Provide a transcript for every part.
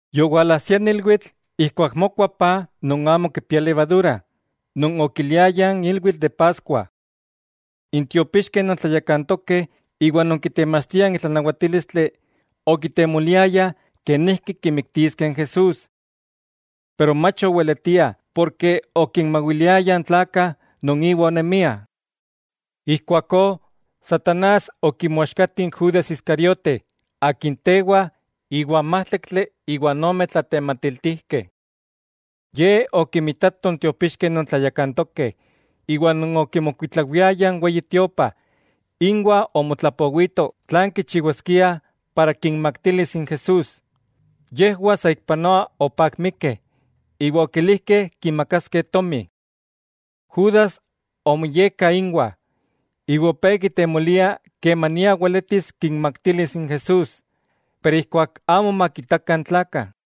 Yowalajsia n ilwitl ijkuak mokua paj non amo kipia levadura, non okiliayah n ilwitl de Paskua. N tiopixkeh non tlayakantokeh iwa non kitemachtiah n tlanawatílistli, okitemoliayah kenijki kimiktiskeh n Jesús. Pero mach oweletiah porke okinmawiliayah n tlakah non iwa onemiah. Ijkuakó, satanás okimoaxkati n Judas Iscariote akin tewa iwan májtlaktli iwa n ome tlatematiltijkeh. Ye okimitato n tiopixkeh non tlayakantokeh iwa non okimokuitlawiayah n Weyi Tiopa, inwah omotlapowito tlan kichiwaskia para kinmaktilis n Jesús. Yejwah saikpanoa opakmikeh iwa okilijkeh kimakaskeh tomi. Judas omoyekka inwah, iwa opé kitemolia kemania weletis kinmaktilis n Jesús, pero ijkuak amo makitakah n tlakah.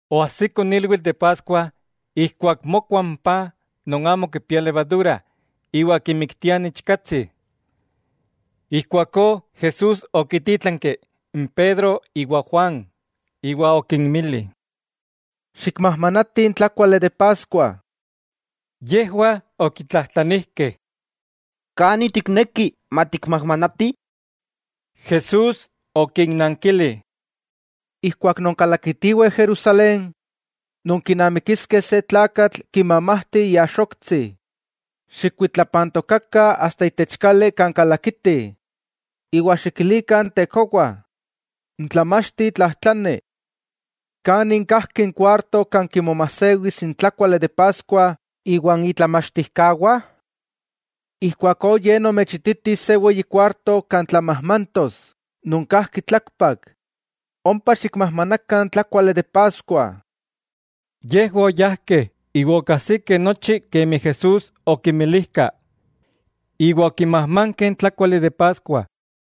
Oajsiko n ilwitl de Paskua ijkuak mokua n paj non amo kipia levadura iwa kimiktiah n ichkatsi. Ijkuakó Jesús okintítlanki n Pedro iwa Juan, iwa okinmili: —Xikmajmanatih n tlákuali de Paskua. Yejwah okitlajtlanijkeh: —¿Kani tikneki matikmajmanatih? Jesús okinnankili: —Ijkuak nonkalakitiweh Jerusalén, nonkinamikiskeh se tlakatl kimamajti iaxoktsi. Xikkuitlapantokakah asta itech kali kan kalakiti, iwa xikilikah n tekowa: “N Tlamachti tlajtlani: ¿Kanin kajki n kuarto kan kimomajsewis n tlákuali de Paskua iwan itlamachtijkawah?” Ijkuakó ye nomechititis se weyi kuarto kan tlamajmantos, non kajki tlakpak; ompa xikmajmanakah n tlákuali de Paskua. Yejwah oyájkeh iwa okajsikeh nochi kemi Jesús okinmilijka, iwa okimajmankeh n tlákuali de Paskua.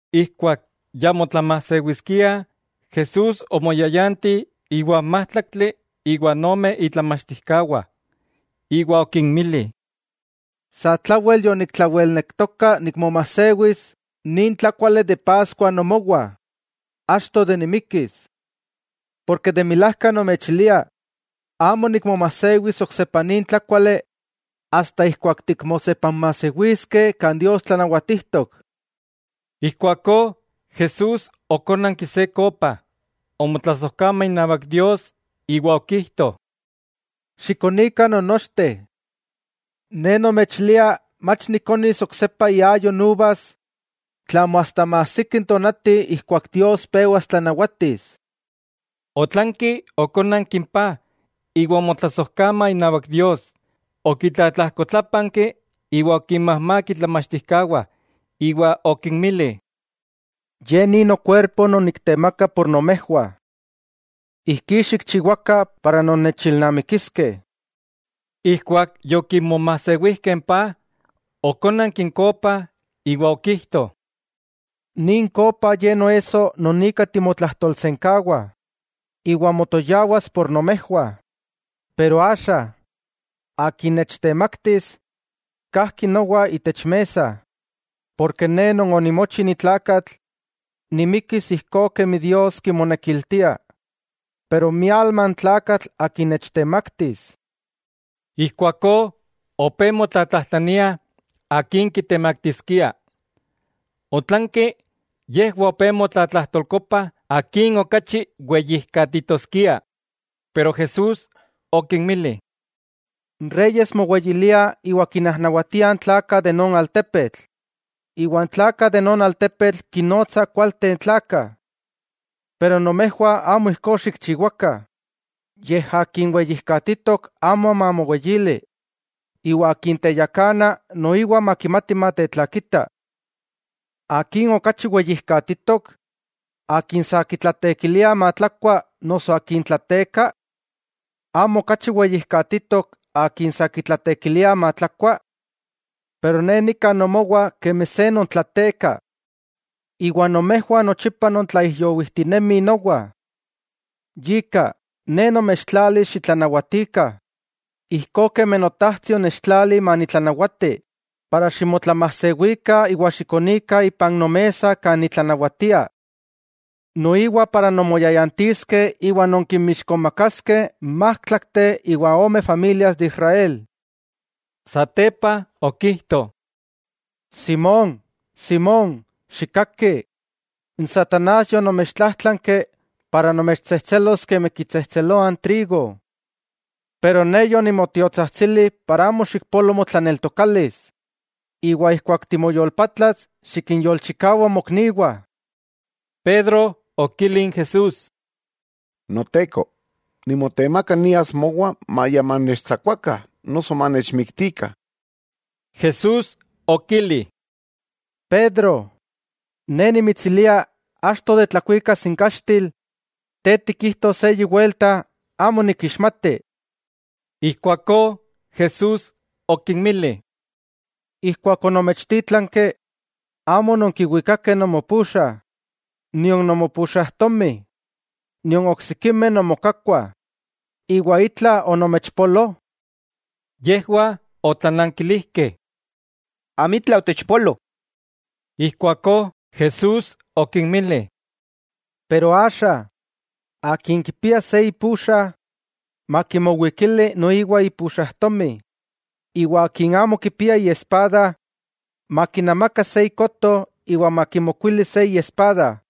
Ijkuak ya motlamajsewiskiah, Jesús omoyayanti iwa n májtlaktli iwa ome itlamachtijkawah. Iwa okinmili: —¡Satlawel yoniktlawelnektoka nikmomajsewis nin tlákuali de Paskua nomowah, achto de nimikkis! Porke de milajka nomechilia, amo nikmomajsewis oksepa nin tlákuali asta ijkuak tikmosepanmajsewiskeh kan Dios tlanawatijtok. Ijkuakó Jesús okónanki se kopa, omotlasojkama inawak Dios, iwa okijto: —Xikonikah non nochteh. Ne nomechilia mach nikonis oksepa iayo n uvas, tlamo asta maajsiki n tonati ijkuak Dios pewas tlanawatis. Otlanki okónanki n paj iwa omotlasojkama inawak Dios; okitlatlajkotlápanki iwa okinmajmák itlamachtijkawah iwa okinmili: —Ye ni nokuerpo non niktemaka por nomejwah. Ijkí xikchiwakah para nonnechilnamikiskeh. Ijkuak yokimomajsewijkeh n paj; okónanki n kopa iwa okijto: —Nin kopa ye noesso non ika timotlajtolsenkawa, iwa motoyawas por nomejwah. 'Pero axa, akin nechtemaktis kajki nowa itech mesa. Porke Ne Non onimochi ni tlakatl, nimikkis ijkó kemi Dios kimonekiltia, pero, ¡mialma n tlakatl akin nechtemaktis! Ijkuakó opé motlatlajtlaniah akin kitemaktiskia. Otlanki yejwah opé motlatlajtolkopah akin okachi weyijkatitoskia. Pero Jesús okinmili: —N reyes moweyiliah iwa kinnajnawatiah n tlakah de non altepetl, iwa n tlakah de non altepetl kinnotsah kualteh n tlakah. Pero nomejwah amo ijkó xikchiwakah, yej akin weyijkatitok, amo mamoweyili; iwa akin teyakana, noiwa makimati matetlakita. ¿Akin okachi weyijkatitok?, ¿akin sa kitlateekiliah matlakua, noso akin tlateeka? ¿Amo okachi weyijkatitok akin sa kitlateekiliah matlakua? Pero Ne nika nomowah kemi se non tlateeka. 'Iwa nomejwah nochipa nontlaijyowijtinemih nowa. Yika, Ne nomechtlalis xitlanawatikah, ijkó kemi Notajtsi onechtlali manitlanawati, para ximotlamajsewikah iwa xikonikah ipan nomesa kan nitlanawatia. Noiwa para nonmoyayantiskeh iwa nonkinmixkomakaskeh n májtlakteh iwa ome familias de Israel. Satepa okijto: —¡Simón, Simón, xikkaki! N satanás yonomechtlájtlanki para nomechtsejtselos kemi kitsejtseloah n trigo; pero Ne yonimotiotsajtsili para amo xikpolo motlaneltokalis. Iwa ijkuak timoyolpatlas, xikinyolchikawa mokniwah. Pedro okili n Jesús: —¡Noteko, nimotemaka nias mowa maya manechtsakuakah noso manechmiktikah! Jesús okili: —Pedro, Ne nimitsilia achto de tlakuikas n kaxtil, te tikijtos eyi welta, “Amo nikixmati.” Ijkuakó Jesús okinmili: —Ijkuak onomechtítlanki, amo ononkiwikakeh nomopuxa, nion nomopuxajtomi, nion oksikimeh nomokakkuah, ¿itla onomechpolo? Yejwah otlanankilijkeh: —Amitla otechpoloh. Ijkuakó Jesús okinmili: —Pero axa, akin kipia se ipuxa, makimowikili noiwa ipuxajtomi, iwa akin amo kipia iespada, makinamaka se ikoto iwa makimokuili se iespada.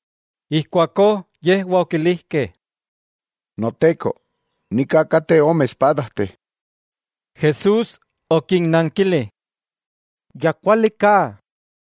Ijkuakó yejwah okilijkeh: —Noteko, nika kateh ome espadajteh. Jesús okinnankili: —Ya kuali ka.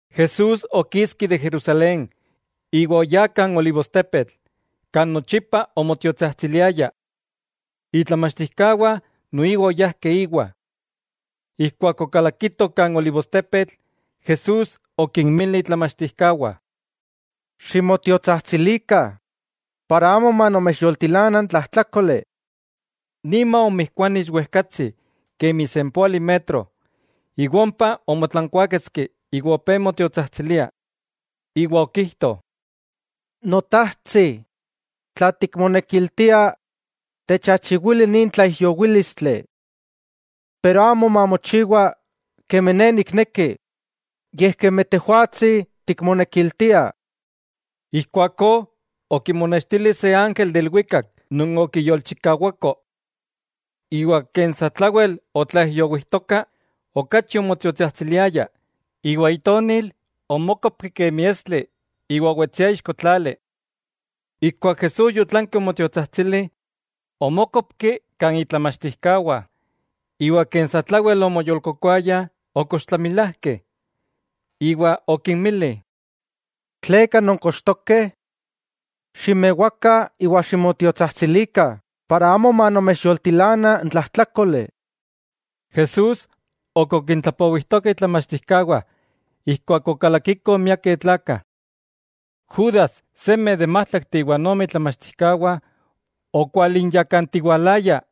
Jesús okiski de Jerusalén iwa oyá kan olivostepetl, kan nochipa onmotiotsajtsiliaya. Itlamachtijkawah noiwa oyajkeh íwa. Ijkuak okalakitoh kan olivostepetl, Jesús okinmili itlamachtijkawah: —Ximotiotsajtsilikah, para amo manomechyoltilana n tlajtlákoli. Nima omijkuani ixwejkatsi kemi sempóali metro, iwa ompa omotlankuáketski iwa opé motiotsajtsilia. Iwa okijto: —Notajtsi, tla tikmonekiltia, techachiwili nin tlaijyowílistli. Pero amo mamochiwa kemi Ne nikneki, yej kemi Tejwatsi tikmonekiltia. Ijkuakó okimonextili se ángel de ilwikak non okiyolchikawako. Iwa ken satlawel otlaijyowijtoka, okachi omotiotsajtsiliaya, iwa itonil omókopki kemi estli iwa owetsia ixko tlali. Ijkuak Jesús otlanki omotiotsajtsili, omókopki kan itlamachtijkawah; iwa ken satlawel omoyolkokoayah, okochtlamilajkeh. Iwa okinmili: —¿Tleka nonkochtokeh? Ximewakah iwa ximotiotsajtsilikah para amo manomechyoltilana n tlajtlákoli. Jesús ok okintlapowijtoka itlamachtijkawah ijkuak okalakikoh miakeh tlakah. Judas seme de n májtlakteh iwa ome itlamachtijkawah okwalinyakantiwalaya,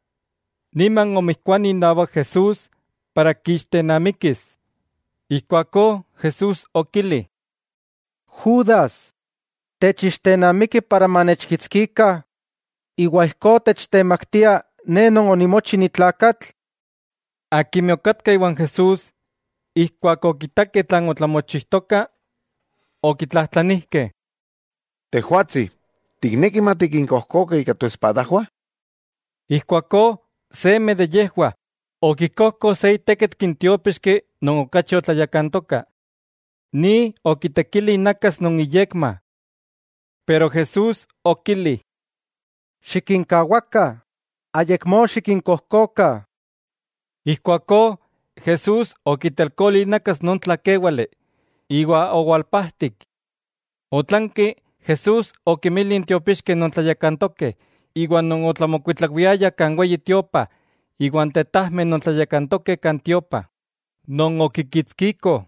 niman omijkuani inawak Jesús para kiixtennamikis. Ijkuakó Jesús okili: —Judas, ¿techixtenamiki para manechkitskikah, iwa ijkó techtemaktia Ne Non onimochi ni tlakatl? Akimeh okatkah iwan Jesús, ijkuak okitakeh tlan otlamochijtoka, okitlajtlanijkeh: —Tejwatsi, ¿tikneki matikinkojkokah ika toespadajwah? Ijkuakó seme de yejwah okikojko se itékitki n tiópixki non okachi otlayakantoka, ni okitekili inakas non iyekma. Pero Jesús okili: —Xikinkawakah, ¡ayakmó xikinkojkokah! Ijkuakó Jesús okitelkoli inakas non tlakéwale, iwa owalpajtik. Otlanki, Jesús okinmili n tiopixkeh non tlayakantokeh, iwa non otlamokuitlawiayah kan Weyi Tiopa iwa n tetajmeh non tlayakantokeh kan tiopa, non okikitskikoh: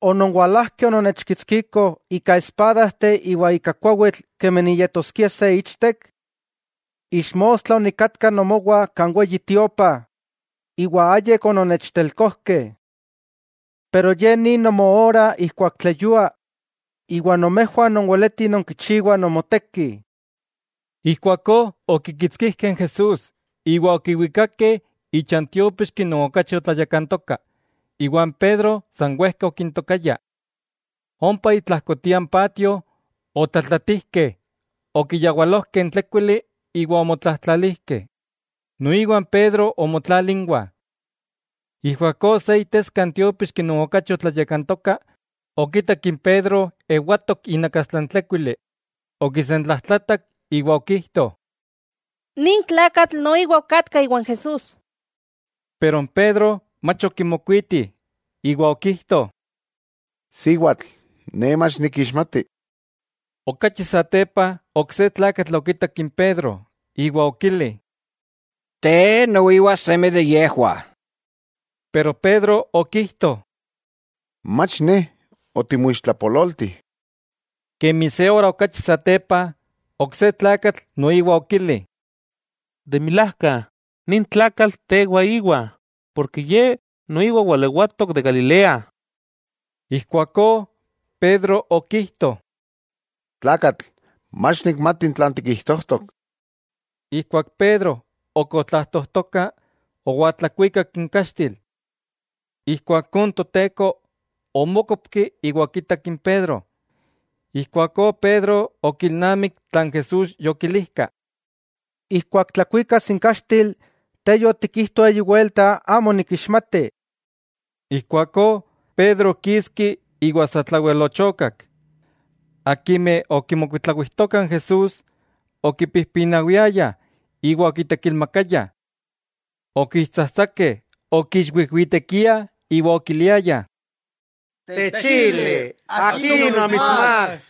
—¿Ononwalajkeh ononnechkitskikoh ika espadajteh iwa ika kuawitl kemi niyetoskia se ichtek? Ixmostla onikatka nomowah kan Weyi Tiopa, iwa ayik ononnechtelkojkeh. Pero ye ni nomoora ijkuak tleyua iwa nomejwah nonweletih nonkichiwah nomoteki. Ijkuakó okikitskijkeh n Jesús, iwa okiwikakeh icha n tiópixki non okachi otlayakantoka, iwa n Pedro san wejka okintokaya. Ompa itlajkotia n patio otlatlatijkeh, okiyawalojkeh n tlékuili iwa omotlajtlalijkeh; noiwa n Pedro omotlali inwah. Ijkuakó se iteska n tiópixki non okachi otlayakantoka okitak n Pedro ewatok inakastla n tlékuili, okisentlajtlatak iwa okijto: —Nin tlakatl noiwa okatka iwa n Jesús. Pero n Pedro mach okimokuiti, iwa okijto: —Siwatl, ne mach nikixmati. Okachi satepa ok se tlakatl okitak n Pedro iwa okili: —Te noiwa seme de yejwah. Pero Pedro okijto: —Mach ne, otimoixtlapololti. Kemi se ora okachi satepa, ok se tlakatl noiwa okili: —De milajka nin tlakatl tewa íwa, ye noiwa walewatok de Galilea. Ijkuakó Pedro okijto: —Tlakatl, mach nikmati tlan tikijtojtok. Ijkuak Pedro ok otlajtojtoka, owaltlakuikak n kaxtil. Ijkuakó n Toteko omókopki iwa okitak n Pedro, ijkuakó Pedro okilnamik tlan Jesús yokilijka: “Ijkuak tlakuikas n kaxtil, te yotikijto eyi welta amo nikixmati.” Ijkuakó Pedro okiski iwa satlawel ochokak. Akimeh okimokuitlawijtokah n Jesús okipijpinawiayah iwa okitekilmakayah. Okiixtsajtsakeh, okiixwijwitekiah iwa okiliayah: —¡Techili, akin omitsmák!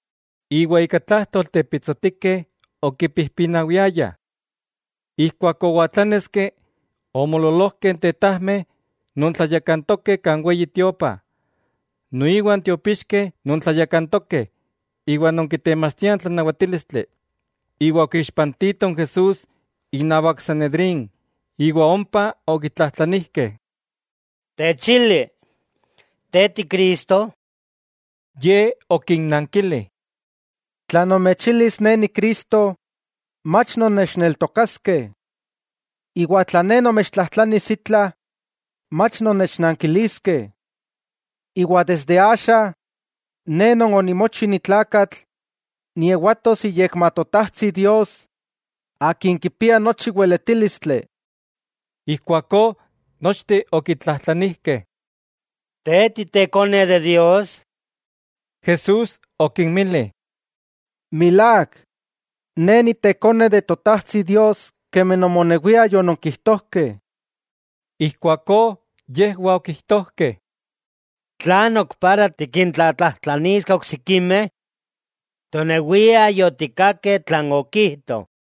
Iwa ika tlájtolteh pitsotikeh okipijpinawiayah. Ijkuak owaltláneski, omoololojkeh n tetajmeh non tlayakantokeh kan Weyi Tiopa, noiwa n tiopixkeh non tlayakantokeh iwa non kitemachtiah n tlanawatílistli, iwa okiixpantitoh n Jesús innawak n Sanedrín. Iwa ompa okitlajtlanijkeh: —Techili, ¿te ti Cristo? Ye okinnankili: —Tla nomechilis Ne Ni Cristo, mach nonnechneltokaskeh. Desde tla Ne nomechtlajtlanis itla, mach nonnechnankiliskeh. Desde axa, Ne Non onimochi ni tlakatl, niewatos iyekma Totajtsi Dios Akin kipia nochi weletílistli. Ijkuakó nochteh okitlajtlanijkeh: —¿Tejwatsi Ikone Dios? Jesús okinmili: —Milák, Ne Ikone n Totajtsi Dios kemi nomonewiah yononkijtojkeh. Ijkuakó yejwah okijtojkeh: —¿Tlan ok para tikintlatlajtlaniskeh oksikimeh? Tonewiah yotikkakeh tlan okijto.